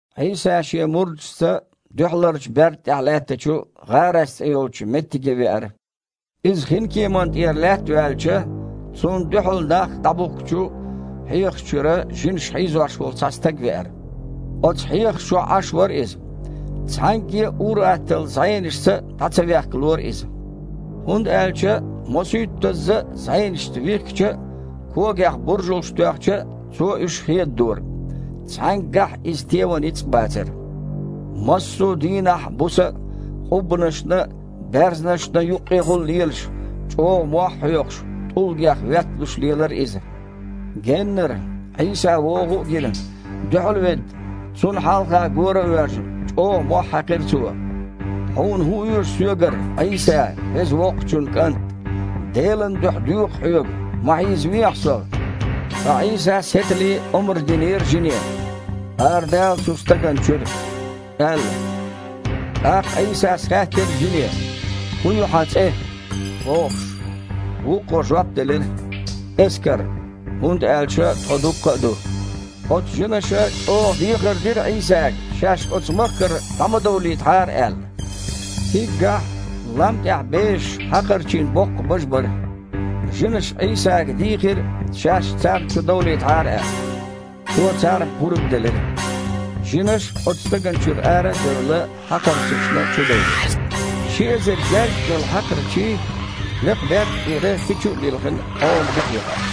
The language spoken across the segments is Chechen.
Іийса шен мурдашца дуьхьаларчу берда тІехь лаьттачу ГІарас цІе йолчу меттиге веара. Иза хинкеманна тІера лаьтта ваьлча, Цунна дуьхьал нах дІабухкучу хьехаш чуьра жинаша хьийзош волу цхьа стаг веара. Оцу хьехаш чохь Іаш вара иза. Цхьаьнгге а ур-атталла зІенашца а дІа ца вехкалора иза, хІунда аьлча мосуьйттазза а зІенашца вихкича а, когех буржалш тоьхча а, цо уьш хедадора. Цхьаьнггахь а иза теван ницкъ а бацара. Массо дийнахь а, буса а къуббанашна а, баьрзнашна а юккъехула а лелаш, чІогІа мохь а хьоькхуш, тІулгех ветталуш лелара иза. Геннара Іийса вогІу а гина, дуьхьал а ведда, Цунна хьалха гора а воьжна, чІогІа мохь хьаькхира цо: «Хьуна хІун оьшу соьгара, Іийса, Веза Воккхачун КІант? Делан дуьхьа доьху Хьоьга, ма хьийзавехьа со?» Ткъа Іийсас хІетале омра динера жине: «Арадала оцу стагана чуьра!» – аьлла. ТІаккха Іийсас хаьттира жине: «ХІун ю хьан цІе?» – бохуш. Вукхо жоп делира: «„Эскар“, хІунда аьлча тхо дуккха а ду». Оцу жинаша чІогІа дехар дира Іийсага, шаьш оцу махкара дІа ма довлийтахьара аьлла. Циггахь лам тІехь бежаш хьакхарчийн боккха бажа бара. Жинаша Іийсага дийхира, шаьш царна чу довлийтахьара аьлла. Цо царна пурба делира. Жинаш, оцу стагана чуьра ара а девлла, хьакхарчашна чудевлира. Ши эзар гергга йолу хьакхарчий, лекхачу берда тІера хи чу а лилхина, Іоман буха яхара.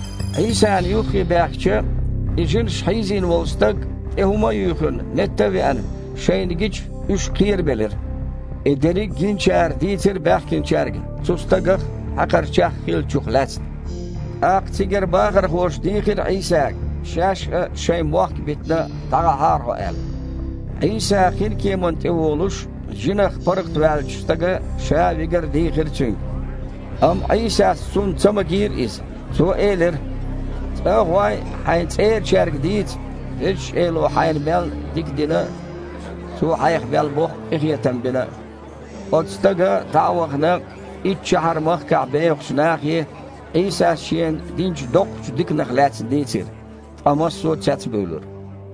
Іийсана юххе баьхкича, и жинаша хьийзина волу стаг, тІе хІума а юьйхина, метта а веана, шайна гича, уьш кхерабелира. И дерриг гиначара дийцира баьхкинчаьрга цу стагах а, хьакхарчех а хиллачух лаьцна. ТІаккха цигара бахархоша дийхира Іийсага, шаьш а, шайн мохк а битина, дІагІахьара Хьо аьлла. Іийса хинкеман тІе волуш, жинех паргІатваьллачу стага ша а вигар дийхира Цуьнга. Амма Іийсас цунна ца магийра иза. Цо элира: «ЦІа а гІой, хьайн цІерачаьрга дийца Везачу Эло хьайна мел дика дина а, Цо хьайх мел боккха къинхетам бина а». Оцу стага, дІа а вахана, Иттшахьар-махкахь бехачу нахе Іийсас шена динчу доккхачу диканах лаьцна дийцира, ткъа массо а цецбуьйлура.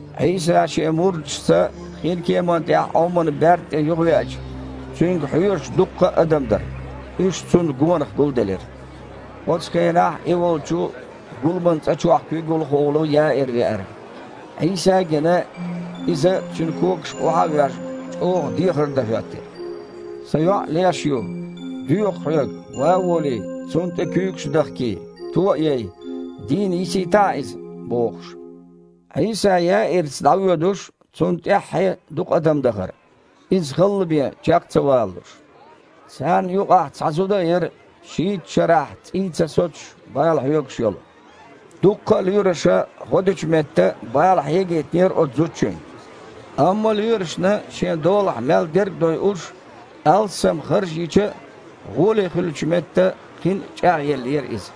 Іийса Шен мурдашца хинкеман тІехь Іоман берда тІе юхавеача, Цуьнга хьоьжуш дукха адам дара. Уьш Цунна гонах гулделира. Оцу хенахь И волчу гуламан цІа чохь куьйгалхо волу Яир веара. Іийса а гина, иза, Цуьнан когашка охьа а воьжна, чІогІа дехар дан хІоьттира: «Сан йоІ леш ю. Доьху Хьоьга, ван а волий, цунна тІе куьйгаш а дахкий, то а яй, дийна йисийтахьа иза», – бохуш. Іийса Яирца дІавоьдуш, Цунна тІаьххье дукха адам дахара, Иза халла бен чекх а ца валалуш. Царна юкъахь цхьа зуда а яра, шийтта шарахь цІий ца соцуш, бала хьоьгуш йолу. Дуккха а лоьраша гІо дечу метта бала хьегийтинера оцу зудчуьнга. Амма лоьрашна шен долахь мел дерг а дойуш, алссам харж йича а, гІоле хуьлучу метта, кхин а чІагІъеллера иза.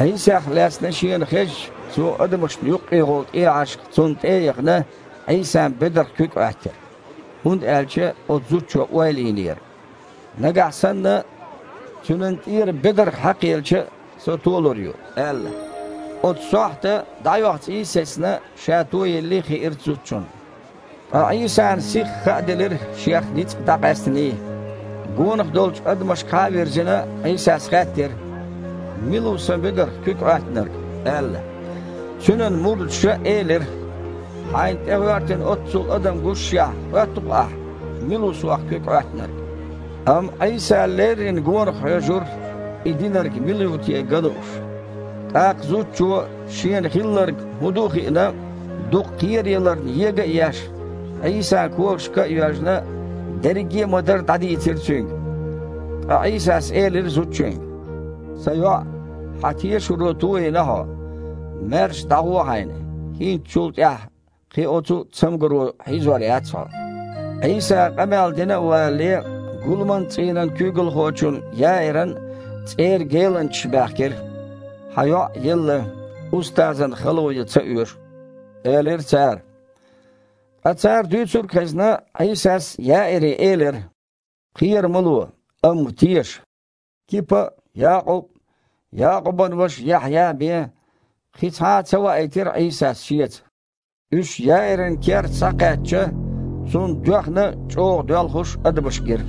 Іийсах лаьцна шена хезча, цо, адамашна юккъехула тІехьашха Цунна тІе а яхана, Іийсан бедарх куьг Іоьттира. ХІунда аьлча оцу зудчо ойла йинера: «Нагахь санна Цуьнан тІера бедарх хьакхаелча а, со толур ю», – аьлла. Оцу сохьта дІаоьху цІий а сецна, ша тоеллий хиира зудчунна. Ткъа Іийсана сихха хааделира Шех ницкъ дІакъаьстиний. Гонах долчу адамашкахьа а вирзина, Іийсас хаьттира: «Мила ву Сан бедарх куьг Іоьттинарг?» – аьлла. Цуьнан мурдаша элира: «Хьайна тІегІоьртина оццул адам гушшехь, хоьтту-кх Ахь: „Мила ву Сох куьг Іоьттинарг?“» Амма Іийса леррина гонах хьоьжура, и динарг мила ву те ган лууш. ТІаккха зудчо, шена хилларг хІун ду а хиъна, дукха кхераяларна ега а еш, Іийсан когашка а йоьжна, дерриге а ма-дарра дІадийцира Цуьнга. Ткъа Іийсас элира зудчуьнга: «Сан йоІ, хьан тешаро тойина хьо. Маьрша дІагІо хьайна, хІинца чул тІаьхьа кхин оцу цамгаро хьийзор яц хьо». Іийса къамел дина а валале, гуламан цІийнан куьйгалхочун Яиран цІера геланчаш баьхкира. «Хьан йоІ елла. Устазана хало ян ца оьшу», – элира цара. Ткъа, цара дуьйцург а хезна, Іийсас Яире элира: «Кхера ма ло, амма теша». Кипа а, Якъуб а, Якъубан ваша Яхьъя а бен, кхин цхьа а ца ваийтира Іийсас Шеца. Уьш Яиран керта схьакхаьчча, Цунна доьхна а, чІогІа доьлхуш а адамаш гира.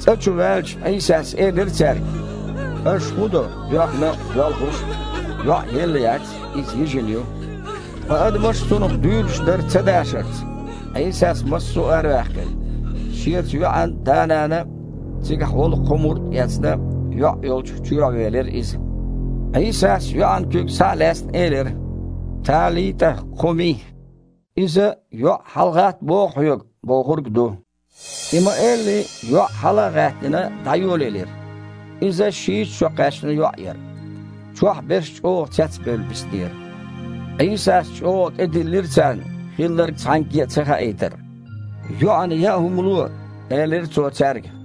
ЦІа чу ваьлча, Іийсас элира цаьрга: «Аша хІун до доьхна а, доьлхуш а? ЙоІ елла яц, иза йижина ю». Ткъа адамаш Цунах дуьйлуш дара цадашарца. Іийсас массо а араваьккхира. Шеца йоьІан да-нана а, цигахь волу кхо мурд а эцна, йоІ йолчу чоьхьавелира Иза. Іийсас, йоьІан куьг схьа а лаьцна, элира: «ТалитІа кхуми!» (иза «ЙоІ, хьалагІатта боху хьоьга!» – бохург ду). И ма-элли, йоІ, хьала а гІаьттина, дІайолаелира (иза шийтта шо кхаьчна йоІ яра). Чохь берш чІогІа цецбевлла биснера. Іийсас чІогІа тІедиллира царна хилларг цхьаьнгге а цахаийтар. «ЙоІана яа хІума ло», – элира Цо цаьрга.